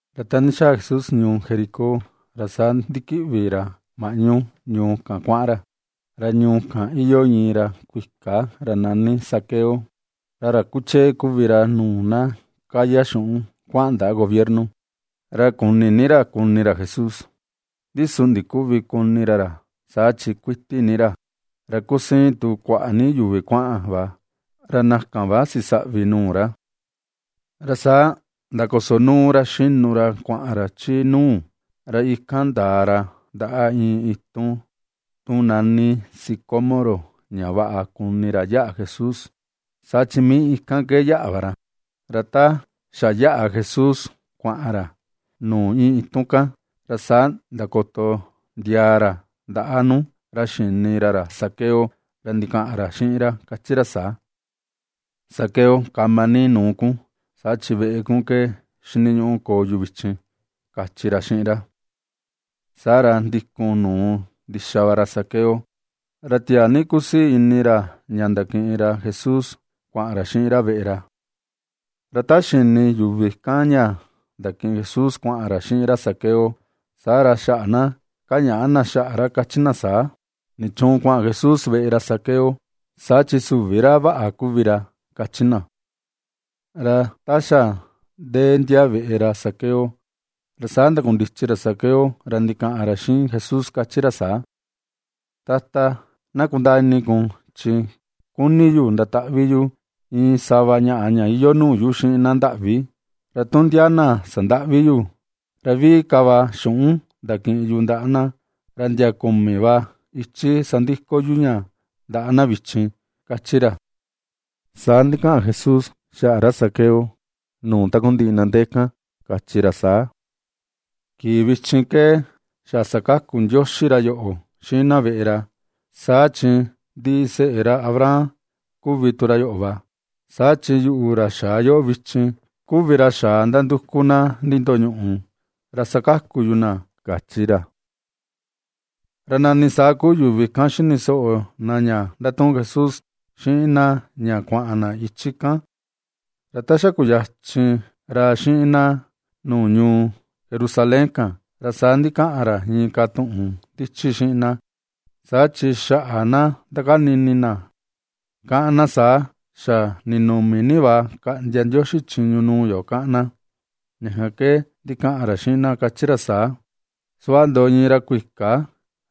Ra ta ndixaa Jesús ñuu Jericó ra saa ndikiꞌvi ra maꞌnu ñuu kan kuaꞌan ra. Ra ñuu kan iyoo iin ra kuika ra nani Zaqueo. Ra ra kuchee kuvi ra nuu na kaya xuꞌun kuaꞌan ndaꞌa gobierno. Ra kuni ni ra kuni ra Jesús, ndi su ndiküvi kuni ra ra, saa chi kuiti ni ra, ra kusiin tu kuaꞌa ni yuvi kuaꞌan va ra na kan va xisaꞌvi nuu ra. Ra saa ndakosonuu ra xinu ra kuaꞌan ra chi nuu, ra ikan ndaa ra ndaꞌa iin itun, tu nani sicómoro ña vaꞌa kuni ra yaꞌa Jesús, saa chi mii ikan ke yaꞌa va ra. Ra ta xa yaꞌa Jesús kuaꞌan ra nuu iin itun kan, ra saa ndakoto ndiaa ra ndaꞌa nuu ra xini ra ra Zaqueo, ra ndikaꞌan xiꞌin ra kachi ra saa: ―Zaqueo, kama ni nuu kun, saa chi veꞌe kun ke xiniñuꞌu koo yu vichin ―kachi ra xiꞌin ra. Saa ra ndikun nuu ndixa va ra Zaqueo, ra tiaa ni kusii ini ra ña ndakiꞌin ra Jesús kuaꞌan ra xiꞌin ra veꞌe ra. Ra ta xini yuvi kan ña ndakiꞌin Jesús kuaꞌan ra xiꞌin ra Zaqueo, saa ra xaꞌa na kañaꞌa na xaꞌa ra kachi na saa: ―¿Nichuun kuaꞌan Jesús veꞌe ra Zaqueo? Saa chi süvi ra vaꞌa kuvi ra ―kachi na. Ra ta xa ndee ndia veꞌe ra Zaqueo, ra saa ndakundichi ra Zaqueo ra ndikaꞌan ra xiꞌin Jesús kachi ra saa: ―Tata, na kundaa ini kun chi kuni yu ndataꞌvi yu iin sava ñaꞌa ña iyoo nuu yu xiꞌin na ndaꞌvi. Ra tu ndia na sandaꞌvi yu, ra viꞌi ka va xuꞌun ndakiꞌin yu ndaꞌa na, ra ndia kumi va ichi sandiko yu ña ndaꞌa na vichin ―kachi ra. Saa ndikaꞌan Jesús xaꞌa ra Zaqueo nuu takundiꞌi na ndee kan kachi ra saa: ―Kii vichin ke xa sakaku Ndioxi ra yoꞌo, xiꞌin na veꞌe ra. Saa chi ndiseꞌe ra Abraham kuvi tu ra yoꞌo va. Saa chi yuꞌu ra xaa yoꞌo vichin, kuvi ra xaa ndanduku na nindoñuꞌu, ra sakaku yu na ―kachi ra. Ra nani saa kuu yuvi kan xini soꞌo na ña ndatuꞌun Jesús xiꞌin na ña kuaꞌan na ichi kan, ra ta xa kuyachin ra xiꞌin na nuu ñuu Jerusalén kan, ra saa ndikaꞌan ra inka tuꞌun ndichi xiꞌin na, saa chi xaꞌa na ndakani ini na kaꞌan na saa: “Xa ninumi ni va kaꞌndia Ndioxi chiñu nuu yo”, kaꞌan na. Ña kan ke ndikaꞌan ra xiꞌin na, kachi ra saa: ―Suꞌva ndoꞌo iin ra kuika,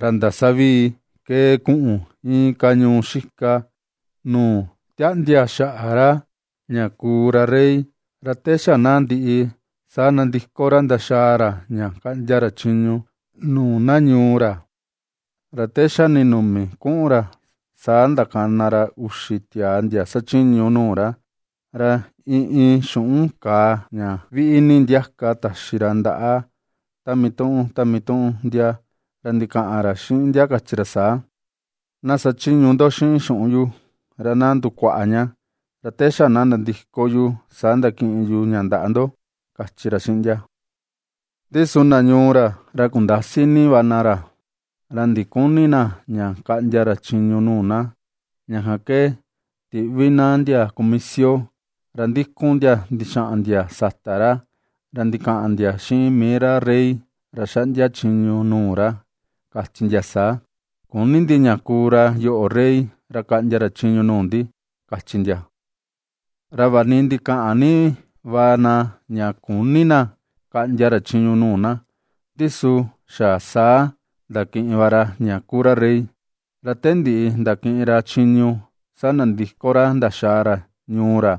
ra ndasavii kee kuꞌun inka ñuu xika, nuu tiaꞌndia xaꞌa ra ña kuu ra rey, ra te xa na ndiꞌi, saa nandiko ra ndaxaa ra ña kaꞌndia ra chiñu nuu na ñuu ra. Ra te xa ndinumi kuꞌun ra, saa ndakana ra uxi tiaa ndia xachiñu nuu ra, ra iin iin xuꞌun kàà ña viꞌi ni ndiaka taxi ra ndaꞌa ta mituꞌun ta mituꞌun ndia ra ndikaꞌan ra xiꞌin ndia kachi ra saa: “Na sachiñu ndo xiꞌin xuꞌun yu, ra na ndukuaꞌa ña, ra te xa na nandiko yu saa ndakiꞌin yu ña ndaꞌa ndo”, kachi ra xiꞌin ndia. Ndi su na ñuu ra, ra kundasi ni va na ra, ra ndiküni na ña kaꞌndia ra chiñu nuu na, ña kan ke tiꞌvi na ndia kumisio ra ndikun ndia ndixaꞌan ndia sata ra, ra ndikaꞌan ndia xiꞌin mii ra rey ra xaꞌndia chiñu nuu ra, kachi ndia saa: “Küni ndi ña kuu ra yoꞌo rey ra kaꞌndia ra chiñu nuu ndi”, kachi ndia. ’Ra vaꞌa ni ndikaꞌan ni va na ña küni na kaꞌndia ra chiñu nuu na, ndi su xa saa ndakiꞌin va ra ña kuu ra rey. Ra te ndiꞌi ndakiꞌin ra chiñu, saa nandiko ra ndaxaa ra ñuu ra,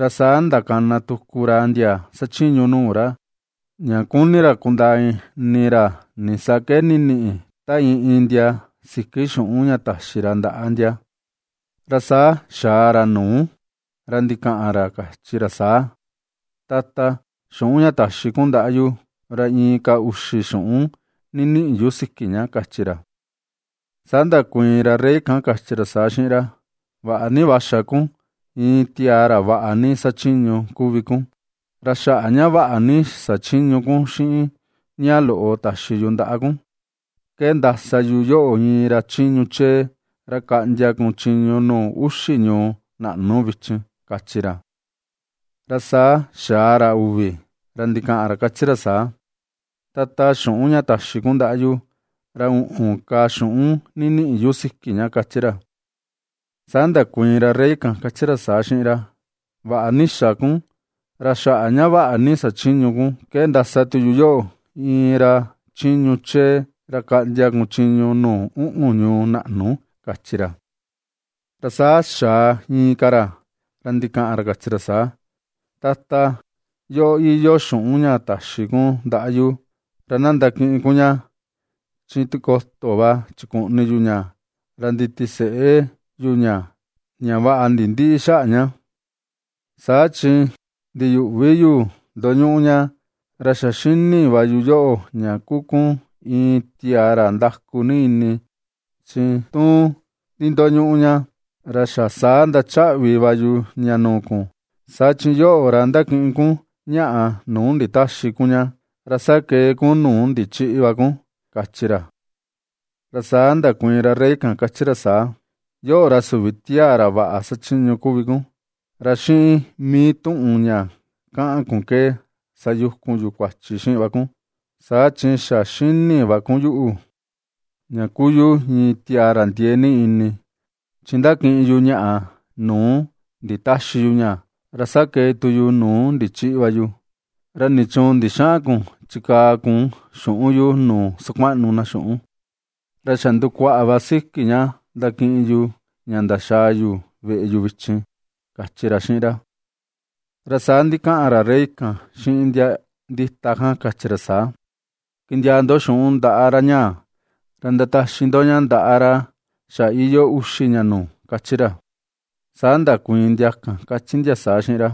ra saa ndakana tuku ra ndia xachiñu nuu ra, ña kuni ra kundaa ini ra nisaa ke ndiniꞌi ta iin iin ndia siki xuꞌun ña taxi ra ndaꞌa ndia. Ra saa xaa ra nuu, ra ndikaꞌan ra, kachi ra saa: “Tata, xuꞌun ña taxi kun ndaꞌa yu, ra inka uxi xuꞌun ndiniꞌi yu siki ña”, kachi ra. Saa ndakuiin ra rey kan, kachi ra saa xiꞌin ra: “Vaꞌa ni va xa kun, iin tiaa ra vaꞌa ni xachiñu kuvi kun, ra xaꞌa ña vaꞌa ni xachiñu kun xiꞌin ña loꞌo taxi yu ndaꞌa kun, ke ndasa yu yoꞌo iin ra chiñu chee ra kaꞌndia kun chiñu nuu uxi ñuu naꞌnu vichin”, kachi ra. Ra saa xaa ra uvi, ra ndikaꞌan ra, kachi ra saa: “Tata, xuꞌun ña taxi kun ndaꞌa yu, ra uꞌun ka xuꞌun ndiniꞌi yu siki ña”, kachi ra. Saa ndakuiin ra rey kan, kachi ra saa xiꞌin ra: “Vaꞌa ni xa kun, ra xaꞌa ña vaꞌa ni xachiñu kun, ke ndasa tu yu yoꞌo iin ra chiñu chee ra kaꞌndia kun chiñu nuu uꞌun ñuu naꞌnu”, kachi ra. ’Ra saa xaa inka ra, ra ndikaꞌan ra kachi ra saa: “Tata, yoꞌo iyoo xuꞌun ña taxi kun ndaꞌa yu. Ra na ndakiꞌin kun ña. Chi tikoto va chikuꞌni yu ña ra nditiseꞌe yu ña ña vaꞌa va nindïꞌi xaꞌa ña. Saa chi ndiyuꞌvi yu ndoñuꞌu ña, ra xa xini va yu yoꞌo ña kuu kun iin tiaa ra ndaku ni ini, chi tu ndindoñuꞌu ña, ra xa saa ndachaꞌvi va yu ña nuu kun, saa chi yoꞌo, ra ndakiꞌin kun ñaꞌa nuu nditäxi kun ña, ra sakee kun nuu ndichïꞌi va kun,” kachi ra. Ra saa ndakuiin ra rey kan, kachi ra saa: “Yoꞌo, ra süvi tiaa ra vaꞌa xachiñu kuvi kun, ra xiꞌin mii tuꞌun ña kaꞌan kun ke sayukun yu kuachi xiꞌin va kun. Saa chi xa xini va kun yuꞌu, ña kuu yu iin tiaa ra ndiee ni ini, chi ndakiꞌin yu ñaꞌa, nuu nditäxi yu ña, ra sakee tu yu nuu ndichïꞌi va yu, ¿ra nichuun ndixäꞌan kun chikaa kun xuꞌun yu nuu sakuaꞌnu na xuꞌun, ra xa ndukuaꞌa va siki ña ndakiꞌin yu ña ndaxaa yu veꞌe yu vichin?”, kachi ra xiꞌin ra. Ra saa ndikaꞌan ra rey kan xiꞌin ndia ndita kan, kachi ra saa: “Kindiaa ndo xuꞌun ndaꞌa ra ñaa, ra ndataxi ndo ña ndaꞌa ra xa iyoo uxi ña nuu”, kachi ra. Saa ndakuiin ndia kan, kachi ndia saa xiꞌin ra: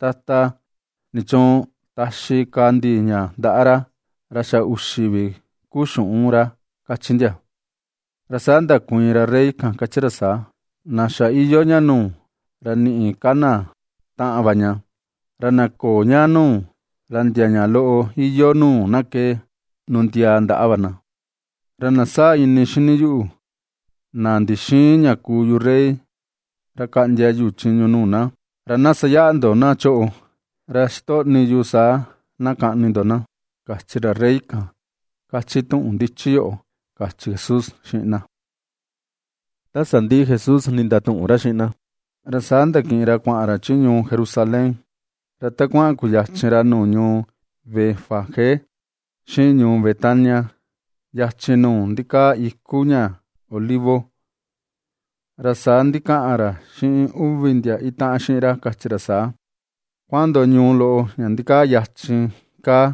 “Tata, ¿nichuun taxi ka ndi ña ndaꞌa ra? Ra xa uxi vi ku xuꞌun ra”, kachi ndia. Ra saa ndakuiin ra rey kan, kachi ra saa: “Na xa iyoo ña nuu, ra niꞌi ka na taꞌan va ña; ra na köo ña nuu, ra ndia ña loꞌo iyoo nuu na ke nundiaa ndaꞌa va na. Ra na sáa̱̱ ini xini yuꞌu, na ndixïin ña kuu yu rey ra kaꞌndia yu chiñu nuu na, ra na sayaꞌa ndo na choꞌo, ra xitoꞌni yu saa na kaꞌni ndo na, kachi ra rey kan, kachi tuꞌun ndichi yoꞌo”, kachi Jesús xiꞌin na. Ta sandiꞌi Jesús ndatuꞌun ra xiꞌin na, ra saa ndakiꞌin ra kuaꞌan ra chi ñuu Jerusalén. Ra ta kuaꞌan kuyachin ra nuu ñuu Betfagé xiꞌin ñuu Betania, yachin nuu ndikaa iku ña olivo, ra saa ndikaꞌan ra xiꞌin uvi ndia itaꞌan xiꞌin ra, kachi ra saa: ―Kuaꞌan ndo ñuu loꞌo ña ndikaa yachin kaa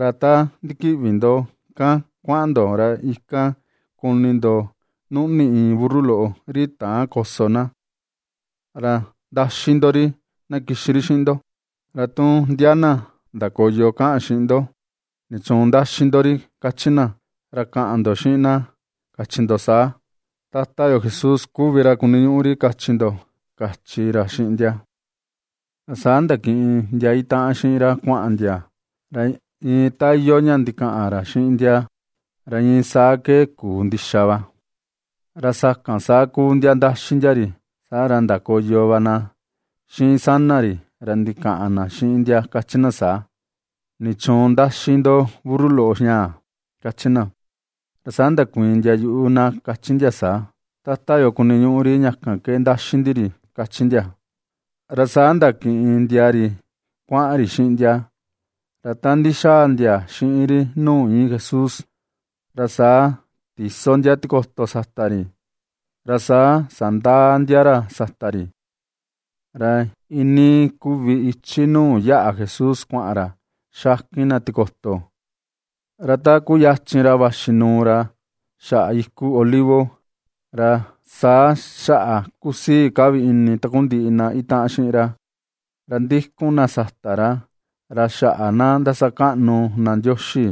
ra ta ndikiꞌvi ndo kan kuaꞌan ndo, ra ikan kuni ndo nuꞌni iin burru loꞌo ri täan koso na. Ra ndaxi ndo ri na kixi ri xiꞌin ndo. Ra tu ndia na ndakoyo kaꞌan xiꞌin ndo: “¿Nichuun ndaxi ndo ri?”, kachi na, ra kaꞌan ndo xiꞌin na xiꞌin na kachi ndo saa: “Tata yo Jesús kuvi ra kuniñuꞌu ri”, kachi ndo ―kachi ra xiꞌin ndia. Ra saa ndakiꞌin ndia itaꞌan xiꞌin ra kuaꞌan ndia, ra iin ta iyoo ña ndikaꞌan ra xiꞌin ndia, ra iin saa ke kuu ndixa va. Ra sakan saa kuu ndia ndaxi ndia ri, saa ra ndakoyo va na xiꞌin sana ri, ra ndikaꞌan na xiꞌin ndia, kachi na saa: ―¿Nichuun ndaxi ndo burru loꞌo ñaa? ―kachi na. Ra saa ndakuiin ndia yuꞌu na, kachi ndia saa: ―Tata yo kuniñuꞌu ri, ña kan ke ndaxi ndi ri ―kachi ndia. Ra saa ndakiꞌin ndia ri kuaꞌan ri xiꞌin ndia, ra ta ndixaa ndia xiꞌin ri nuu iin Jesús, ra saa tiso ndia tikoto sata ri, ra saa sandaa ndia ra sata ri. Ra iinii kuvi ichi nuu yaꞌa Jesús kuaꞌan ra, xakin na tikoto. Ra ta kuyachin ra vaxi nuu ra xaꞌa iku Olivo, ra saa xaꞌa kusii ka vi ini takundiꞌi na itaꞌan xiꞌin ra, ra ndikun na sata ra, ra xaꞌa na ndasakaꞌnu na Ndioxi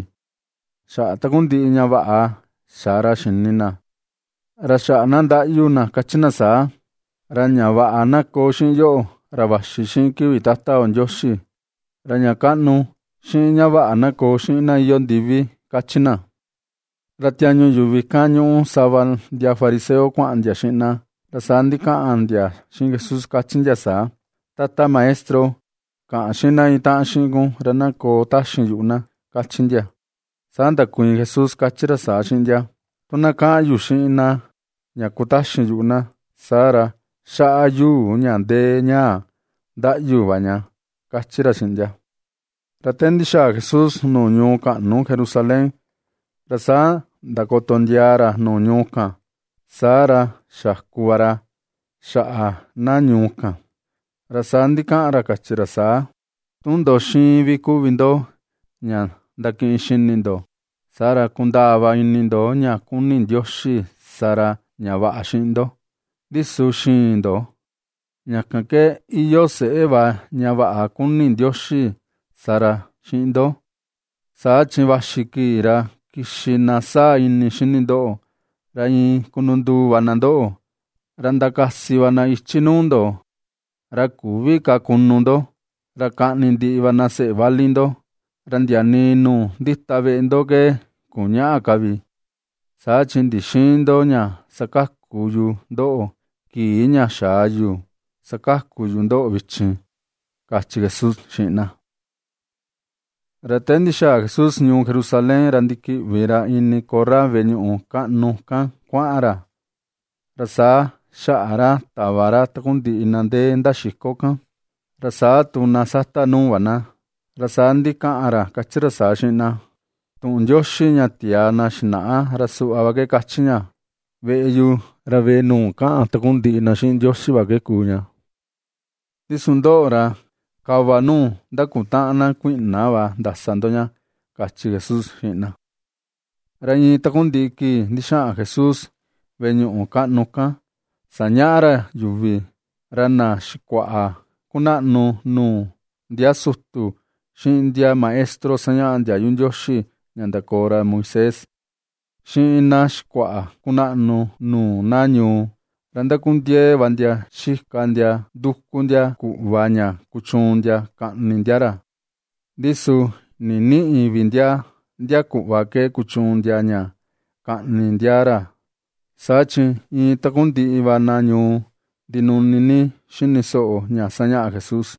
xaꞌa takundiꞌi ña vaꞌa xa ra xini na. Ra xaꞌa na ndaꞌyu na kachi na saa: ―¡Ra ña vaꞌa na koo xiꞌin yoꞌo, ra vaxi xiꞌin kivi Tata yo Ndioxi! ¡Ra ña kaꞌnu, xiꞌin ña vaꞌa na koo xiꞌin na iyoo ndivi! ―kachi na. Ra tiañu yuvi kan ñuꞌu sava ndia fariseo kuaꞌan ndia xiꞌin na, ra saa ndikaꞌan ndia xiꞌin Jesús, kachi ndia saa: ―Tata Maestro, kaꞌan xiꞌin na itaꞌan xiꞌin kun ra na koo taxin yuꞌu na ―kachi ndia. Saa ndakuiin Jesús, kachi ra saa xiꞌin ndia: ―Tu na kaꞌan yu xiꞌin na ña kutaxin yuꞌu na, saa ra xaꞌa yuu ña ndee ñaa ndaꞌyu va ña ―kachi ra xiꞌin ndia. Ra te ndixaa Jesús nuu ñuu kaꞌnu Jerusalén, ra saa ndakoto ndiaa ra nuu ñuu kan, saa ra xaku va ra xaꞌa na ñuu kan. Ra saa ndikaꞌan ra kachi ra saa: ―¡Tu ndo xiin vi kuvi ndo ña ndakiꞌin xini ndo, saa ra kundaa va ini ndo ña kuni Ndioxi sa ra ña vaꞌa xiꞌin ndo! Ndi su xïin ndo. Ra ña kan ke iyoo seꞌe va ña vaꞌa kuni Ndioxi sa ra xiꞌin ndo. Saa chi vaxi kii, ra kixi na sáa̱̱ ini xini ndoꞌo, ra iin kununduu va na ndoꞌo, ra ndakasi va na ichi nuu ndo, ra küvi ka kunu ndo. Ra kaꞌni ndiꞌi va na seꞌe vali ndo, ra ndia nii nuu ndita veꞌe ndo ke kuñäꞌa ka vi; saa chi ndixïin ndo ña sakaku yu ndoꞌo, kii ña xaa yu sakaku yu ndoꞌo vichin ―kachi Jesús xiꞌin na. Ra te ndixaa Jesús ñuu Jerusalén, ra ndikiꞌvi ra ini korra veꞌe ñuꞌu kaꞌnu kan kuaꞌan ra, ra saa xaꞌa ra tava ra takundiꞌi na ndee ndaxiko kan, ra saa tu na sata nuu va na. Ra saa ndikaꞌan ra kachi ra saa xiꞌin na: ―Tuꞌun Ndioxi ña tiaa na xinaꞌa ra suꞌva va ke kachi ña: “Veꞌe yu, ra veꞌe nuu kaꞌan takundiꞌi na xiꞌin Ndioxi va ke kuu ña.” Ndi su ndoꞌo, ra kava nuu ndakutaꞌan na kuiꞌna va ndasa ndo ña ―kachi Jesús xiꞌin na. Ra iin takundiꞌi kii ndixaꞌan Jesús veꞌe ñuꞌu kaꞌnu kan sañaꞌa ra yuvi, ra na xikuaꞌa kunaꞌnu nuu ndia sutu, xiꞌin ndia maestro sañaꞌa ndiayu Ndioxi ña ndakoo ra Moisés, xiꞌin na xikuaꞌa kunaꞌnu nuu na ñuu, ra ndakundiee va ndia xika ndia nduku ndia kuꞌva ña kuchuun ndia kaꞌni ndia ra. Ndi su ndinïꞌi vi ndia ndia kuꞌva ke kuchuun ndia ña kaꞌni ndia ra, saa chi iin takundiꞌi va na ñuu ndinuni ni xini soꞌo ña sañaꞌa Jesús.